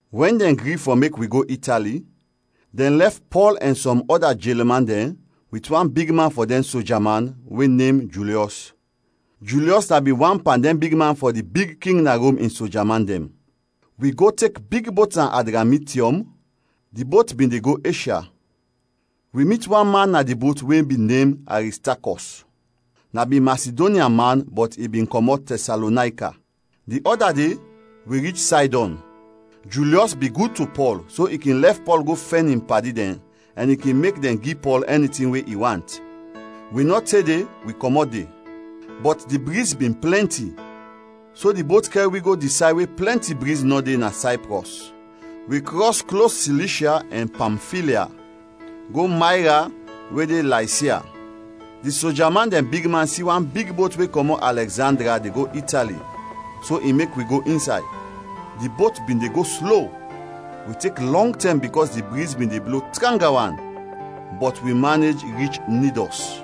Wɛn dɛn gri fɔ mek wi go Itali, dɛn lɛf Pɔl ɛn sɔm ɔda jelman dɛn wit wan bigman fɔ dɛn soja man, we nem Julyɔs. Julyɔs na bin wan pan dɛn bigman fɔ di big king na Rom in soja man dɛn. Wi go tek big bot na Adramitiɔm; di bot bin de go Eshya. Wi mit wan man na di bot we bin nem Aristakɔs, na bin Masidonya man bɔt i bin kɔmɔt Tɛsalonayka. Di ɔda de wi rich Saydɔn. Julyɔs bin gud to Pɔl so i kin lɛf Pɔl fɔ go fɛn in padi dɛn ɛn i kin mek dɛn gi Pɔl ɛni tin we i want. Wi nɔ te de wi kɔmɔt de, bɔt di briz bin plɛnti so di bot kɛr wi go di say we plɛnti briz nɔ de na Sayprɔs. Wi krɔs klos Silishya ɛn Pamfilya, go Mayra we de Laysia. Di soja man dɛn bigman si wan big bot we kɔmɔt Alɛgzandria de go Itali so i mek wi go insay. Di bot bin de go slo, wi tek lɔng tɛm bikɔs di briz bin de blo tranga wan, bɔt wi manej rich Nidɔs.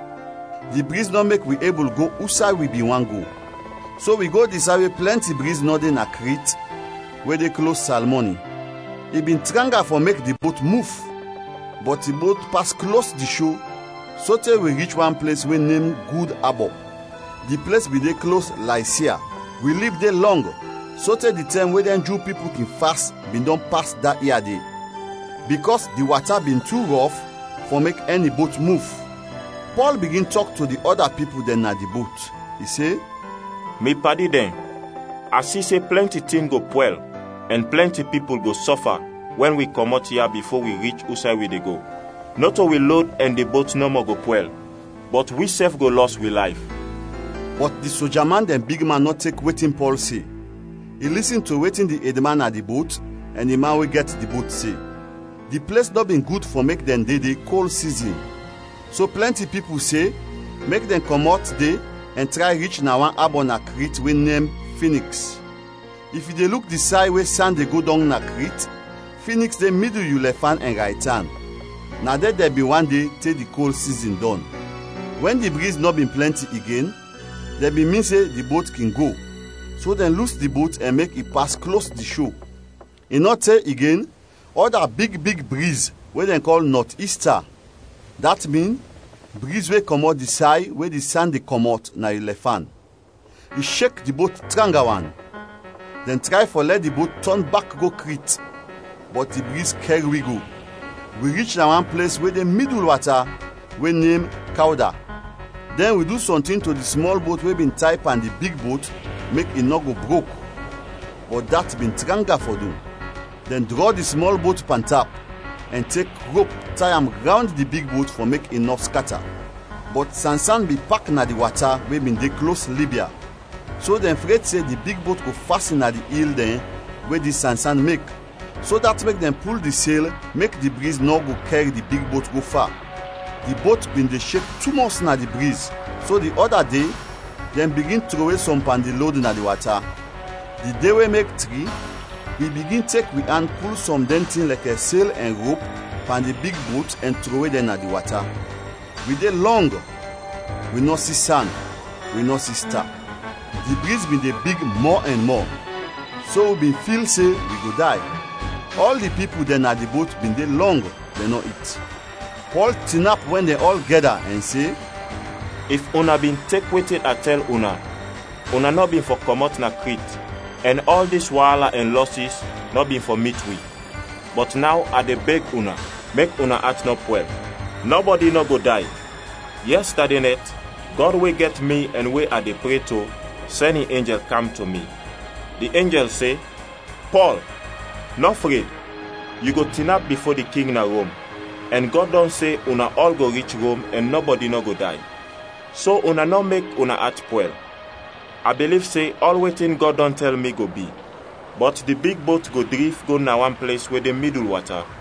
Di briz nɔ mek wi ebul go usay wi bin want go, so wi go di say we plɛnti briz nɔ de na Krit we de klos Salmoni. I bin tranga fɔ mek di bot muf, bɔt di bot pas klos di sho sote wi rich wan ples we nem Gud Abɔ, di ples bin de klos Laysia. Wi lib de lɔng, sote di tɛm we dɛn Ju pipul kin fas bin dɔn pas da ia de; bikɔs di wata bin tu rɔf fɔ mek ɛni bot muf. Pɔl bigin tɔk to di ɔda pipul dɛn na di bot. I se, “Mi padi dɛn, a si se plɛnti tin go pwɛl ɛn plɛnti pipul go sɔfa wɛn wi kɔmɔt ya bifo wi rich usay wi de go. Nɔto wi lod ɛn di bot nɔmɔ go pwɛl, bɔt wisɛf go lɔs wi layf.” Bɔt di soja man dɛn bigman nɔ tek wetin Pɔl se, i lisin to wetin di edman na di bot ɛn di man we gɛt di bot se. Di ples nɔ bin gud fɔ mek dɛn de de kol sizin, so plɛnti pipul se mek dɛn kɔmɔt de ɛn tray rich na wan abɔ na Krit we nem Finiks; if yu de luk di say we san de go dɔng na Krit, Finiks de midul yu lɛfan ɛn raytan. Na de dɛn bin want de te di kol sizin dɔn. Wɛn di briz nɔ bin plɛnti igen, dɛn bin min se di bot kin go, so dɛn lus di bot ɛn mek i pas klos di sho. I nɔ te igen, ɔda big big briz we dɛn kɔl “Nɔt-ista” (dat min “Briz we kɔmɔt di say we di san de kɔmɔt, na yu lɛfan”) I shek di bot tranga wan. Dɛn tray fɔ lɛ di bot tɔn bak go Krit, bɔt di briz kɛr wi go. Wi rich na wan ples we de midul wata, we nem Kawda. Dɛn wi du sɔntin to di smɔl bot we bin tay pan di big bot mek i nɔ go brok, bɔt dat bin tranga fɔ du. Dɛn drɔ di smɔl bot pantap, ɛn tek rop tay am rawnd di big bot fɔ mek i nɔ skata. Bɔt sansan bin pak na di wata, we bin de klos Libya, so dɛn fred se di big bot go fasin na di il dɛn we di sansan mek, so dat mek dɛn pul di sel mek di briz nɔ go kɛr di big bot go fa. Di bot bin de shek tumɔs na di briz so di ɔda de dɛn bigin trowe sɔm pan di lod na di wata. Di de we mek tri, wi bigin tek wi an pul sɔm dɛn tin lɛkɛ sel ɛn rop pan di big bot ɛn trowe dɛn na di wata. Wi de lɔng, wi nɔ si san, wi nɔ si sta. Di briz bin de big mɔ ɛn mɔ, so wi bin fil se wi go day. Ɔl di pipul dɛn na di bot bin de lɔng, dɛn nɔ it; Pɔl tinap wɛn dɛn ɔl gɛda ɛn se, “If una bin tek wetin a tɛl una, una nɔ bin fɔ kɔmɔt na Krit ɛn ɔl dis waala ɛn lɔsis nɔ bin fɔ mit wi. Bɔt naw a de beg una, mek una at nɔ pwɛl. Nɔbɔdi nɔ go day. Yɛstade nɛt, Gɔd we gɛt mi ɛn we a de pre to sɛn in enjɛl kam to mi. Di enjɛl se, ‘Pɔl, nɔ fred! Yu go tinap bifo di king na Rom; ɛn Gɔd dɔn se una ɔl go rich Rom ɛn nɔbɔdi nɔ go day.’ So, una nɔ mek una at pwɛl, a biliv se ɔl wetin Gɔd dɔn tɛl mi, go bi. Bɔt di big bot go drif go na wan ples we de midul wata.”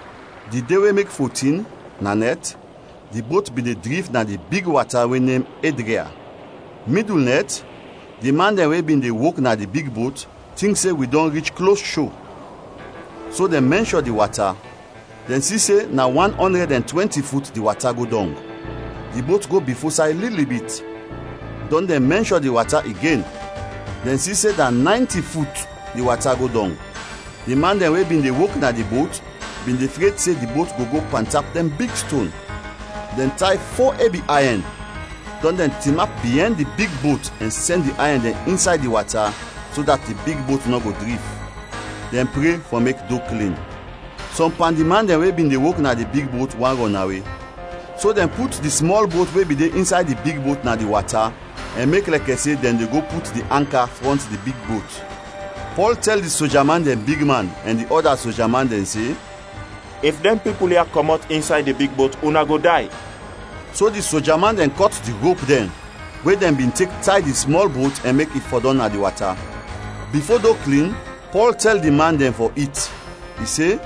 Di de we mek fotin, na nɛt, di bot bin de drif na di big wata we nem Edria. Midul nɛt, di man dɛn we bin de wok na di big bot tink se wi dɔn rich klos sho. So dɛn mɛnshɔ di wata, dɛn si se na wan ɔndrɛd ɛn twɛnti fut di wata go dɔng. Di bot go bifo say lili bit, dɔn dɛn mɛnshɔ di wata igen, dɛn si se na naynti fut di wata go dɔng. Di man dɛn we bin de wok na di bot bin de fred se di bot go go pantap dɛn big ston. Dɛn tay fo ebi ayɛn, dɔn dɛn tinap biɛn di big bot ɛn sɛn di ayɛn dɛn insay di wata so dat di big bot nɔ go drif. Dɛn pre fɔ mek do klin. Sɔm pan di man dɛn we bin de wok na di big bot bin want rɔnawe. So dɛn put di smɔl bot we bin de insay di big bot na di wata ɛn mek lɛkɛ se dɛn de go put di anka frɔnt di big bot. Pɔl tɛl di soja man dɛn bigman ɛn di ɔda soja man dɛn se, “If dɛn pipul ya kɔmɔt insay di big bot, una go day!” So di soja man dɛn kɔt di rop dɛn we dɛn bin tek tay di smɔl bot ɛn mek i fɔdɔm na di wata. Bifo do klin, Pɔl tɛl di man dɛn fɔ it, i se,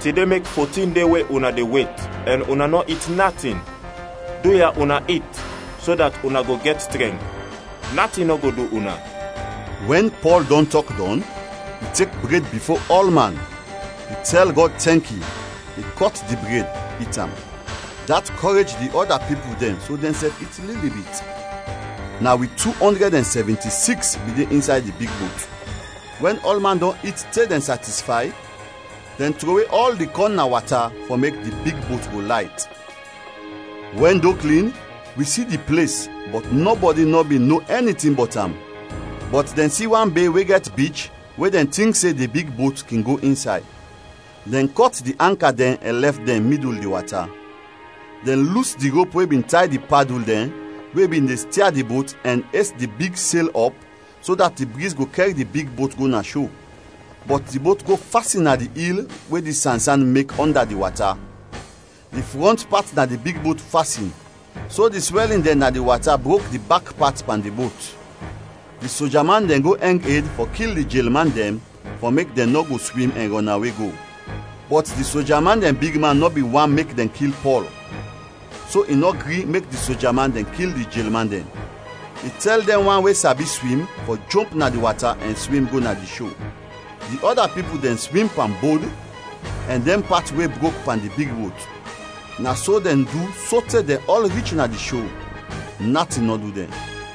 “Tide mek fotin de we una de wet ɛn una nɔ it natin. Duya, una it so dat una go gɛt trɛnk. Natin nɔ go du una.” Wɛn Pɔl dɔn tɔk dɔn, i tek bred bifo ɔlman, i tɛl Gɔd tɛnki, i kɔt di bred, it am. Dat kɔrej di ɔda pipul dɛn so dɛnsɛf it lili bit. Na wi tu ɔndrɛd ɛn sɛvinti-siks bin de insay di big bot. Wɛn ɔlman dɔn it te dɛn satisfay, dɛn trowe ɔl di kɔn na wata fɔ mek di big bot go layt. Wɛn do klin, wi si di ples, bɔt nɔbɔdi nɔ bin no ɛni tin bɔt am, bɔt dɛn si wan be we gɛt bich we dɛn tink se di big bot kin go insay. Dɛn kɔt di anka dɛn ɛn lɛf dɛn midul di wata. Dɛn lus di rop we bin tay di padul dɛn we bin de stia di bot ɛn es di big sel ɔp so dat di briz go kɛr di big bot go na sho. Bɔt di bot go fasin na di il we di sansan mek ɔnda di wata; di frɔnt pat na di big bot fasin, so di swɛlin dɛn na di wata brok di bak pat pan di bot. Di soja man dɛn go ɛng ed fɔ kil di jelman dɛn fɔ mek dɛn nɔ go swim ɛn rɔnawe go. Bɔt di soja man dɛn bigman nɔ bin want mek dɛn kil Pɔl, so i nɔ gri mek di soja man dɛn kil di jelman dɛn. I tɛl dɛn wan we sabi swim fɔ jomp na di wata ɛn swim go na di sho. Di ɔda pipul dɛn swim pan bod ɛn dɛn pat we brok pan di big bot. Na so dɛn du sote dɛn ɔl rich na di sho, natin nɔ du dɛn.